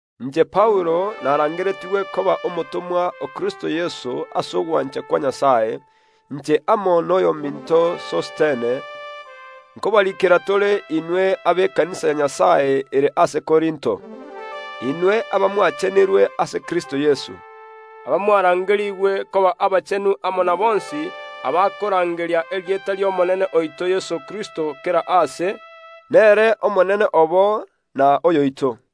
Inche Paulo narangeretigwe koba omotomwa o Kristo Yeso ase ogwancha kwa Nyasae. Inche amo noyominto Sostene nkobariikera tore inwe abekanisa ya Nyasae ere ase Korinto, inwe abamwachenirwe ase Kristo Yeso, abamwarangerigwe koba abachenu amo na bonsi abakorangeria erieta ri’Omonene oito Yeso Kristo kera aase, nere Omonene obo na oyoito.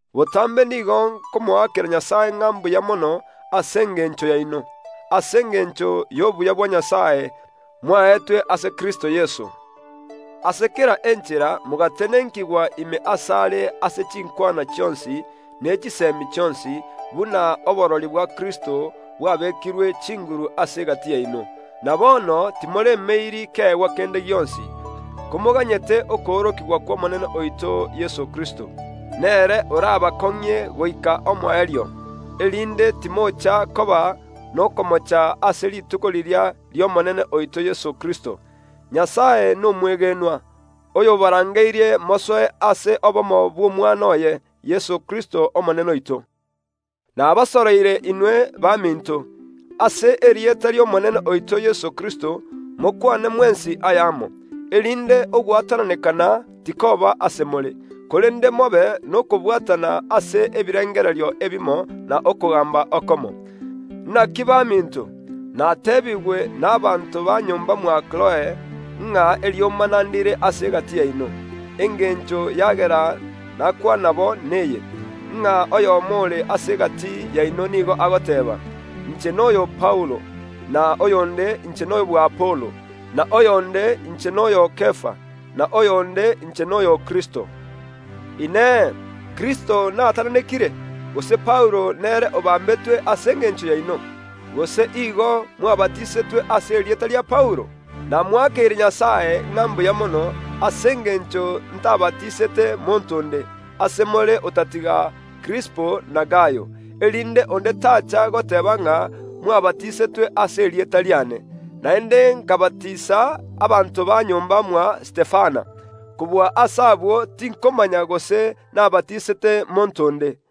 Botambe nigo nkomoakera Nyasae ng’a mbuya mono ase engencho yaino, ase engencho y’obuya bwaye obwo mwaetwe ase Kristo Yeso. Ase kera enchera mogatenenkigwa ime asare ase chinkwana chionsi, ne chisemi chionsi, buna oborori bwa Kristo bwabekirwe chinguru ase egati yaino. Na bono timoremeiri keegwa kende gionsi, komoganyete okoorokigwa kw’Omonene oito Yeso Kristo. Nere orabakong’ie goika omoerio, erinde timocha koba nokomocha ase rituko riria ri’Omonene oito Yeso Kristo. Nyasae nomwegenwa, oyobarangeirie mosoe ase obomo bw’Omwana oye, Yeso Kristo Omonene oito. Nabasoroire inwe, baminto, ase erieta ri’Omonene oito Yeso Kristo, mokwane mwensi ayamo, erinde ogwatananeka tikoba ase more; korende mobe nokobwatana ase ebirengererio ebimo na okogamba okomo. Naki baminto, nateebigwe nabaanto ba nyomba mwa Kiloe, ng’a eriomana ndire ase egati yaino. Engencho yagera nakwana bo neye, ng’a oyomo ore ase egati yaino nigo agoteeba, “Inche noyo o Paulo,” na oyonde, “Inche noyo bw’Apolo,” na oyonde, “Inche noyo o Kefa,” na oyonde, “Inche noyo o Kristo.” Inee! Kristo naatananekire? Gose Paulo nere obambetwe ase engencho yaino? Gose igo mwabatisetwe koba aborokigwa ba Paulo? Namoakeire Nyasae ng’a mbuya mono, ase engencho ntabatisete monto onde, ase more otatiga Krispo na Gayo, erinde onde tacha goteeba ng’a mwabatisetwe ase erieta riane. (Naende nkabatisa abanto ba nyomba mwa Stefana. Kobua ase abwo, tinkomanya gose nabatisete monto onde.)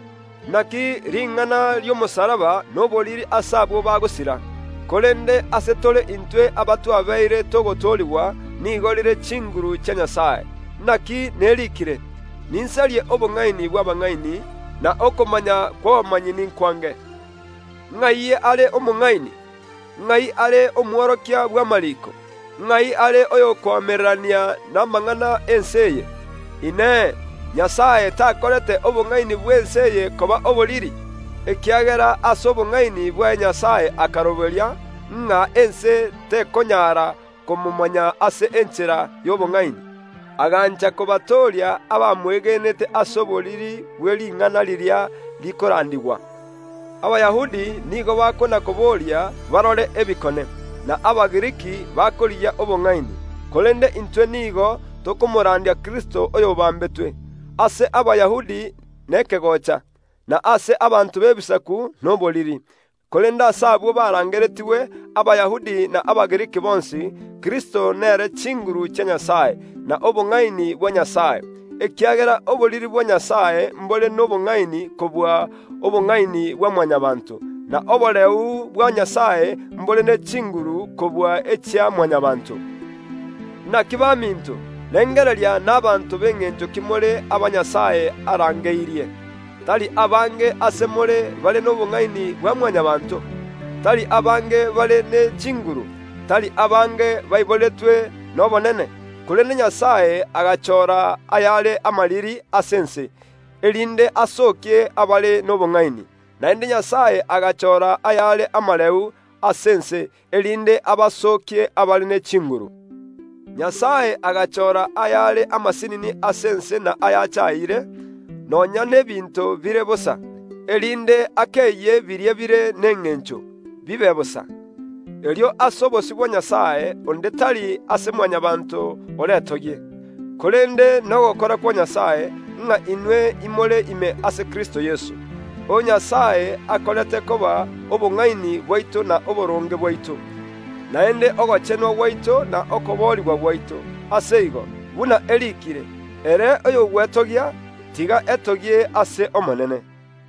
Naki ring’ana ri’ogokwa kwa Yeso ase omosalaba noboriri ase abwo bagosira, korende ase tore intwe abatwabeire togotoorigwa nigo rire chinguru chia Nyasae. Naki neriikire, “Ninsarie obong’aini bw’abang’aini, na okomanya kw’abamanyi ninkwange.” Ng’ai are omong’aini? Ng’ai are omworokia bw’amariiko? Ng’ai are oyokoamererania namang’ana ’ense eye? Inee! Nyasae takorete obong’aini bw’ense eye koba oboriri? Ekiagera ase obong’aini bwaye Nyasae akaroberia, ng’a ense tekonyara komomanya ase enchera y’obong’aini, agancha kobatooria abamwegenete ase oboriri bw’ering’ana riria rikorandigwa. Abayahudi nigo bakonakoboria barore ebikone, na Abagiriki bakorigia obong’aini, korende intwe nigo tokomorandia Kristo oyobambetwe, ase Abayahudi nekegocha, na ase abanto b’Ebisaku noboriri. Korende ase abwo barangeretigwe, Abayahudi na Abagiriki bonsi, Kristo nere chinguru chia Nyasae, na obong’aini bwa Nyasae. Ekiagera oboriri bwa Nyasae mbore nobong’aini kobua obongaini bwa Mwanyabaanto, na oboreu bwa Nyasae mbore ne chinguru kobua echia Mwanyabaanto. Naki baminto, rengereria nabaanto b’engencho ki more aba Nyasae arangeirie; tari abange ase more bare nobong’aini bwa Mwanyabaanto, tari abange bare ne chinguru, tari abange baiboretwe nobonene. Korende Nyasae agachora ayare amariri ase ense, erinde asookie abare nobong’aini; naende Nyasae agachora ayare amareu ase ense, erinde abasookie abare ne chinguru. Nyasae agachora ayare amasinini ase ense na ayachayire, nonya n’ebinto bire bosa, erinde akeyie biria bire nengencho, bibe bosa. Erio ase obosio bwa Nyasae onde tari ase Mwanyabaanto oretogie. Korende nogokora kwa Nyasae, ng’a inwe imore ime ase Kristo Yeso, oyo Nyasae akorete koba obong’aini bwaito na oboronge bwaito, naende ogochenwa gwaito na okoboorigwa gwaito. Ase igo buna eriikire, “Ere oyogwetogia, tiga etogie ase keria Omonene akorire.”